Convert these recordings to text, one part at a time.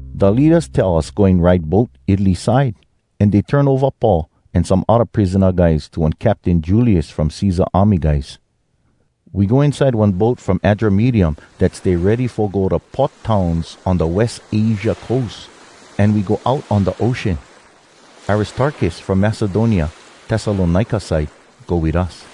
Da leadas tell us goin ride boat Italy side, an dey turn ova Paul an some odda prisona guys to one captain Julius from Cesar army guys. We go inside one boat from Adramyttium dat stay ready fo go da port towns on da West Asia coast, an we go out on da ocean. Aristarkus from Macedonia, Tessalonika side, go wit us.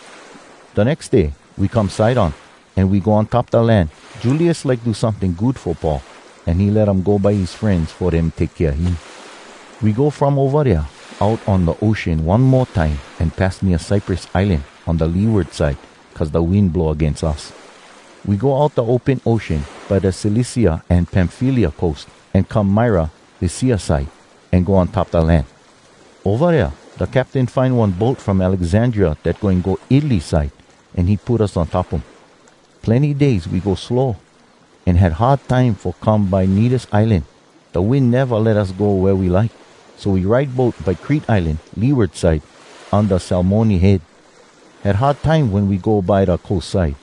Da nex day we come Sidon, an we go on top da land. Julius like do someting good fo Paul, an he let um go by his frenz fo dem take kea him. We go from ova dea out on da ocean one mo time an pass nea Cyprus Islan on da leeward side cuz da wind blow agains us. We go out da open ocean by da Cilicia an Pamfylia coast, an come Myra, Lycia side, an go on top da land. Ova dea da captain find one boat from Alexandria dat goin go Italy side, an he put us on top um. Plenny days we go slow, an had hard time fo come by Knidus Islan. Da wind neva let us go da way we like, so we ride boat by Crete Islan, leeward side, unda Salmone Head. Had hard time wen we go by da coast side.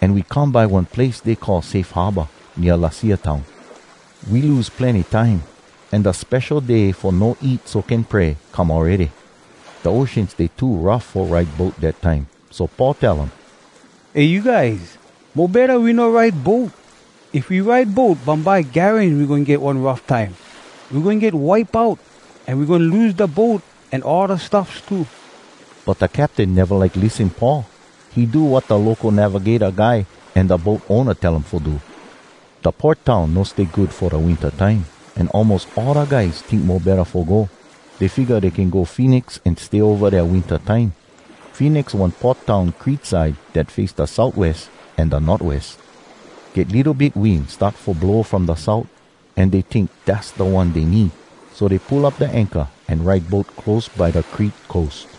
An we come by one place dey call “Safe Harbor” nea Lasea town. We lose plenny time, an da Spesho Day Fo No Eat So Can Pray come awready. Da ocean stay too rough fo ride boat dat time. So Paul tell um, “Eh, you guys. Mo betta we no ride boat. If we ride boat bumbye garans we goin get one rough time. We goin get wipe out, an we goin lose da boat an all da stuffs too.” But da captain neva like lissen Paul. He do wat da local navigata guy an da boat owna tell um fo do. Da port town no stay good fo da winta time, an almos all da guys tink mo betta fo go. Dey figga dey can go Phoenix an stay ova dea winta time. Phoenix one port town Crete side dat face da southwest an da northwest. Get litto bit wind start fo blow from da south, an dey tink dass da one dey need. So dey pull up da anchor an ride boat close by da Crete coast.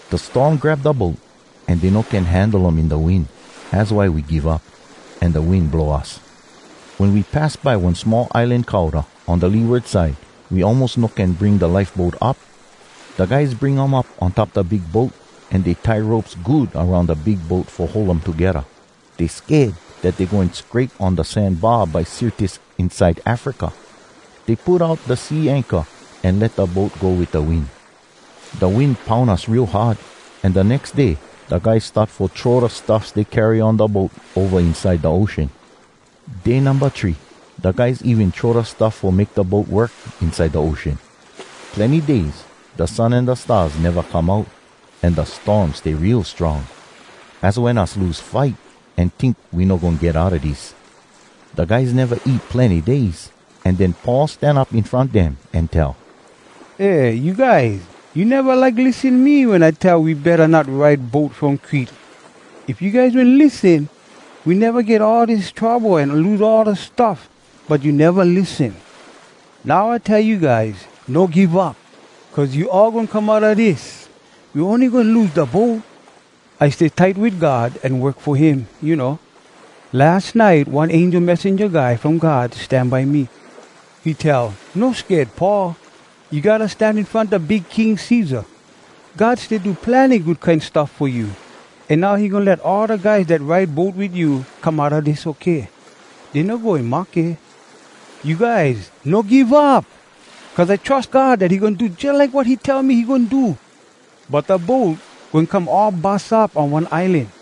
Da storm grab da boat, an dey no can handle um in da wind. Az why we give up, an da wind blow us. Wen we pass by one small islan Cauda, on da leeward side, we almos no can bring da lifeboat up. Da guys bring um up on top da big boat, an dey tie ropes good aroun da big boat fo hold um togedda. Dey sked dat dey goin scrape on da sand bar by Syrtis inside Africa. Dey put out da sea anchor an let da boat go wit da wind. Da wind poun us real hard, an da nex day da guys start fo throw da stuffs dey carry on da boat ova inside da ocean. Day numba three, da guys even throw da stuff fo make da boat work inside da ocean. Plenny days da sun an da stars neva come out, an da storm stay real strong. Az wen us lose fight an tink we no goin get outa dis. Da guys neva eat plenny days, an den Paul stan up in front dem an tell, “Eh, you guys, you neva like lissen me wen I tell we betta not ride boat from Crete. If you guys wen lissen, we neva get all dis trouble an lose all da stuffs, but you neva lissen. Now I tell you guys, no give up, cuz you all goin come outa dis. We ony goin lose da boat. I stay tight wit God an work fo him, you know. Las nite one angel messenja guy from God stan by me. He tell, ‘No sked, Paul. You gotta stan in front da Big King Cesar. God stay do plenny good kine stuff fo you, an now he goin let all da guys dat ride boat wit you come outa dis okay. Dey no goin mahke.’ You guys, no give up! Cuz I trus God dat he goin do jalike wat he tell me he goin do. But da boat goin come all bus up on one islan.”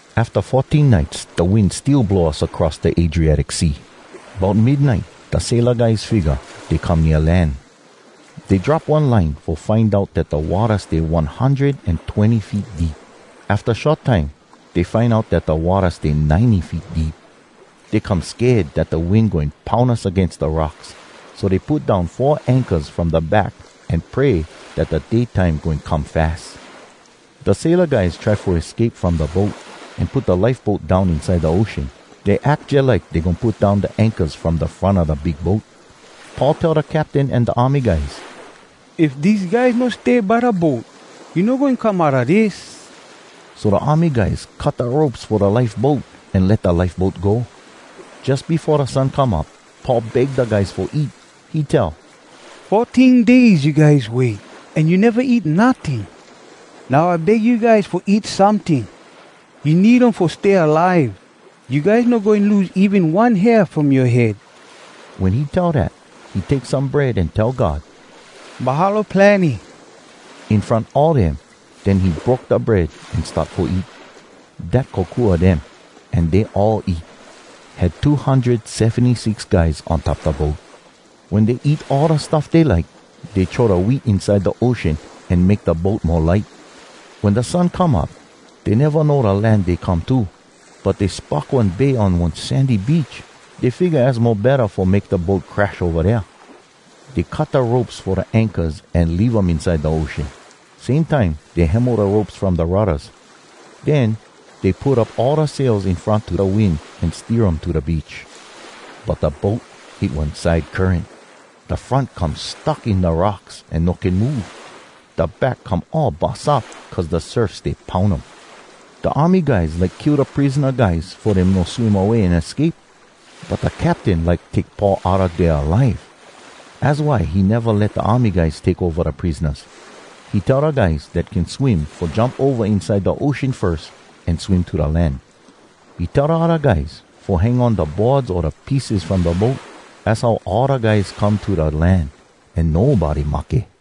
Afta fourteen nites da wind still blow us across da Adriatic Sea. Bout midnite da saila guys figga dey come nea land. Dey drop one line fo find out dat da watta stay one hundred an twenny feet deep. Afta short time dey find out dat da watta stay ninety feet deep. Dey come sked dat da wind goin poun us agains da rocks. So dey put down four anchors from da back an pray dat da day time goin come fas. Da saila guys try fo escape from da boat, an put da lifeboat down inside da ocean. Dey ack jalike dey goin put down da anchors from da front a da big boat. Paul tell da captain an da army guys, “If dese guys no stay by da boat, you no goin come outa dis.” So da army guys cut da ropes fo da lifeboat an let da lifeboat go. Jus befo da sun come up, Paul beg da guys fo eat. He tell, “Fourteen days you guys wait, an you neva eat notting. Now I beg you guys fo eat someting. You need um fo stay alive. You guys no goin lose even one hair from yoa head.” Wen he tell dat, he take some bread an tell God “Mahalo plenny!” in front all dem. Den he broke da bread an start fo eat. Dat kokua dem, an dey all eat. (Had two hundred seventy-six guys on top da boat.) Wen dey eat all da stuff dey like, dey throw da wheat inside da ocean an make da boat mo light. Wen da sun come up, dey neva know da land dey come to. But dey spock one bay an one sandy beach. Dey figga az mo betta fo make da boat crash ova dea. Dey cut da ropes fo da anchors an leave um inside da ocean. Same time dey hemo da ropes from da ruddas. Den dey put up all da sails in front to da wind an steer um to da beach. But da boat hit one side current. Da front come stuck in da rocks an no can move. Da back come all bus up cuz da surf stay poun um. Da army guys like kill da prisona guys fo dem no swim away an escape. But da captain like take Paul outa dea alive, az why he neva let da army guys take ova da prisonas. He tell da guys dat can swim fo jump ova inside da ocean firs an swim to da land. He tell da odda guys fo hang on da boards o da pieces from da boat. Az how all da guys come to da land, an nobody mahke.